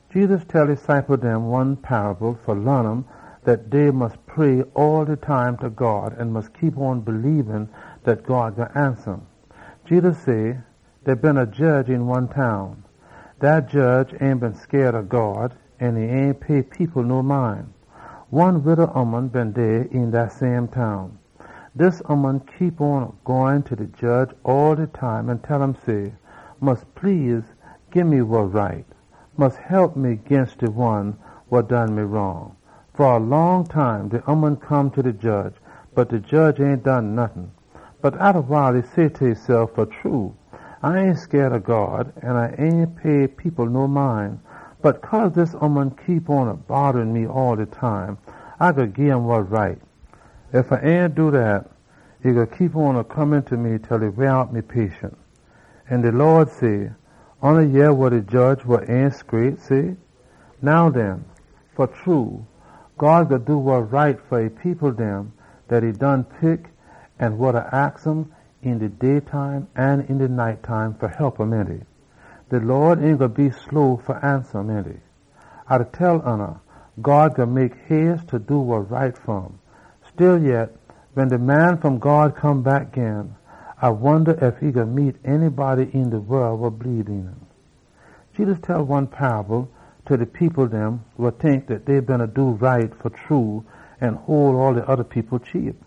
Jedus tell e ciple dem one paable fa laan um dat dey mus pray all de time ta God an mus bleebe dat God gwine ansa um. Jedus say, “Dey been a jedge een one town. Dat jedge ain been scaid ob God, an e ain pay people no mind. One wida ooman been dey een dat same town. Dis ooman beena go ta de jedge all de time an tell um say, ‘Mus please gii me wa right. Mus hep me ginst de one wa done me wrong.’ Fa a long time, de ooman come ta de jedge, bot de jedge ain done nottin. Bot atta wile e say ta esef, ‘Fa true, A ain scaid ob God, an A ain pay people no mind. Bot cause dis ooman da bodda me all de time, A gwine gim wa right. Ef A ain do dat, e gwine keep on da come ta me til e weah me out!’” An de Lawd say, “Oona yeh wa de jedge wa ain scraight say. Now den, fa true, God gwine do wa right fa e people, dem dat e done pick an wa da aks um een de day time an een de night time fa hep um, ainty? De Lawd ain gwine be slow fa ansa um, ainty? A da tell oona, God gwine mek hace fa do wa right fa um! Stillyet, wen de Man wa Come fom God come back gin, A wonda ef e gwine meet anybody een de wol wa bleebe een um!” Jedus tell one paable ta de people dem wa tink dat dey beena do right an hole all de oda people cheap.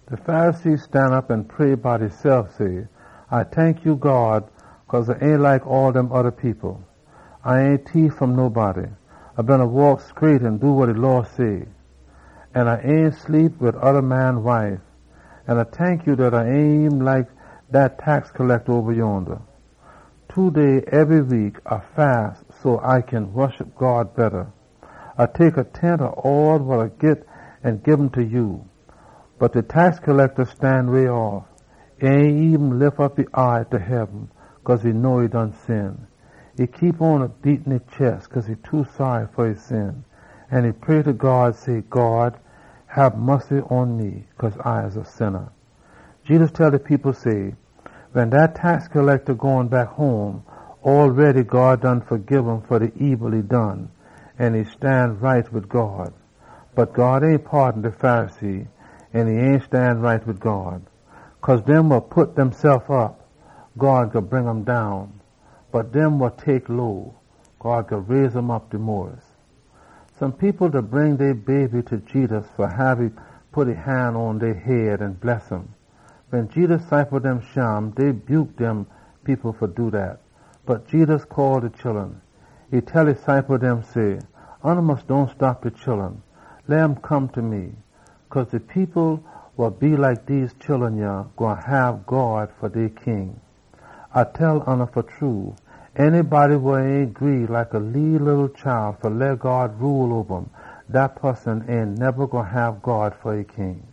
“De Pharisee stanop an pray bout esef say, ‘A tank ya, God, cause A ain like all dem oda people. A ain tief fom nobody. A beena waak scraight an do wa de Law say. An A ain sleep wid oda man wife. An A tank ya dat A ain eben like dat man oba yonda wa da geda tax. Two day ebry week A da fast so A kin woshup ya betta. A tek a tent ob all wa A git an gim ta ya.’ Bot de man wa da geda tax stan way off. E ain eben lif e eye ta heaben, cause e know e done sin. E beena beat e chest cause e too saary fa e sin. An e pray ta God say, ‘God, hab mussy pon me, cause A a sinna!’” Jedus tell de people say, “Wen dat man gone back home, God done fagib um fa de ebil e done, an e stan right wid God. Bot God ain paadon de Pharisee. Cause dem wa pit deysef op, God gwine bring um down. Bot dem wa tek low, God gwine raise um op mo den all.” Some people beena bring dey baby ta Jedus fa hab um pit e han pon dey head an bless um. Wen Jedus ciple dem shim, dey buke dem people fa do dat. Bot Jedus call de chullun. E tell e ciple dem say, “Oona mus dohn stop de chullun. Leh um come ta me. Cause de people wa like dese chullun yah gwine hab God rule oba um. A da tell oona fa true, de poson wa ain gree like a leeleetle chile fa leh God rule oba um, dat poson ain neba gwine hab God fa e King.”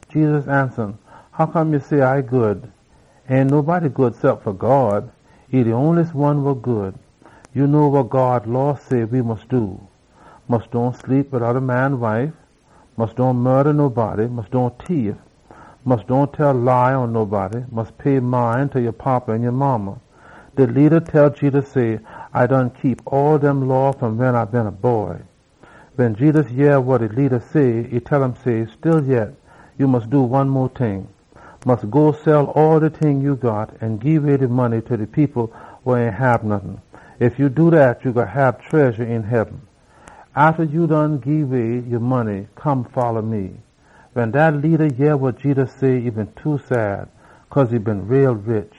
Jedus ansa um say, “Hoccome ya da say A good? Ain nobody good cep fa God. Ya know wa God Law chaage we fa do. ‘Mus dohn sleep wid oda man wife. Mus dohn kill nobody. Mus dohn tief. Mus dohn tell lie pon nobody. Mus pay mind ta ya fada an ya modda.’” De leada tell Jedus say, “A done keep all dem law fom wen A been a boy.” Wen Jedus yeh wa de leada say, e tell um, “Stillyet ya mus do one mo ting. Mus go sell ebryting ya got an gii de money ta de people wa ain got nottin. Ef ya do dat, ya gwine hab tredja een heaben. Atta ya done gii way ya money, come folla me.” Wen dat leada yeh wa Jedus say, e been sad, cause e been too rich.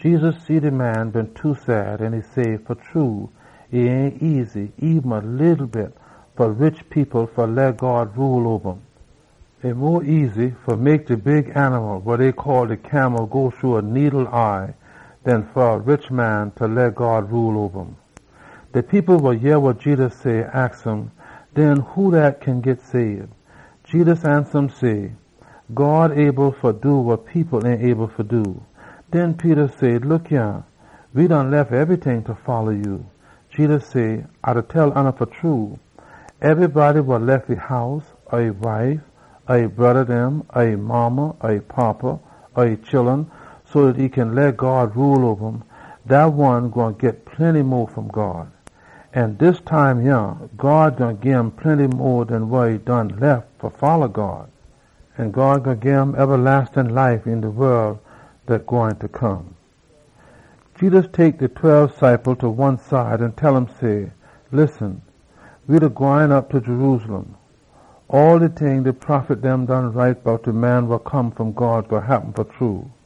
Jedus see de man been too sad an e say, “Fa true e ain easy eben a leetle bit fa rich people fa leh God rule oba um. E mo easy fa mek de camel go shru a needle eye den fa a rich man fa come onda God rule.” De people wa yeh wa Jedus say, aks um, “Den who dat kin git sabe?” Jedus ansa say, “God able fa do wa people ain able fa do.” Den Peter say, “Look yah! We done lef ebryting fa folla ya.” Jedus say, “A da tell oona fa true, ebrybody wa lef e house, or e wife, or e broda dem, or e modda or e fada, or e chullun so dat e kin leh God rule oba um, dat one gwine git plenty mo fom God. Een dis time yah, God gwine gim plenty mo den wa e done lef fa folla God. An God gwine gim ebalastin life een de wol dat gwine come.” Jedus tek de tweb ciple dem ta one side an tell um say, “Listen, we da gwine op ta Jerusalem. All de ting dem de prophet dem done write bout de Man wa Come fom God gwine happen fa true.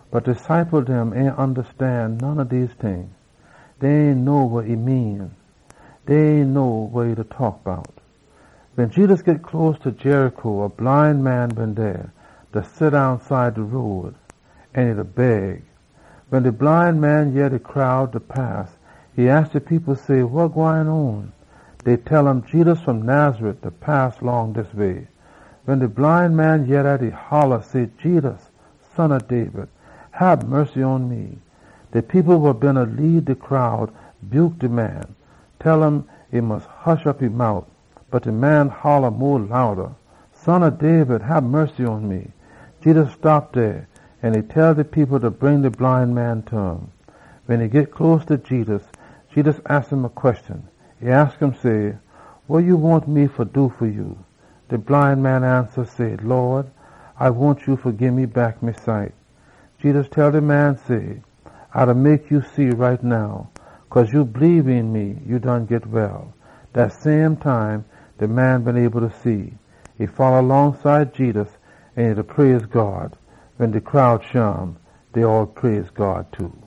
Bot de ciple dem ain ondastan none ob dese ting. Dey ain know wa e mean. Dey ain know wa e beena taak bout. Wen Jedus git close ta Jericho, a bline eye man been dey, da seddown side de road, an e beena beg. Wen de bline man yeh de crowd da pass, e aks de people say, “Wa gwine on?” Dey tell um, “Jedus fom Nazareth da pass long dis way.” Wen de bline man yeh dat, e holla say, “Jedus, Son ob David, hab mussy pon me!” De people wa beena lead de crowd buke de man, tell um e mus hush op e mout. Bot de man holla mo louda say, “Son ob David, hab mussy pon me!” Jedus stop dey, an e chaage de people fa bring de bline man ta um. Wen e git close ta Jedus, Jedus aks um say, “Wa ya wahn me fa do fa ya?” De bline man ansa say, “Lawd, A wahn fa see gin.” Jedus tell de man say, “A da mek ya see. Cause ya bleebe een me, ya done git well!” Dat same time de man been able fa see. E folla longside Jedus, da praise God. Wen de crowd shim, dey all praise God too.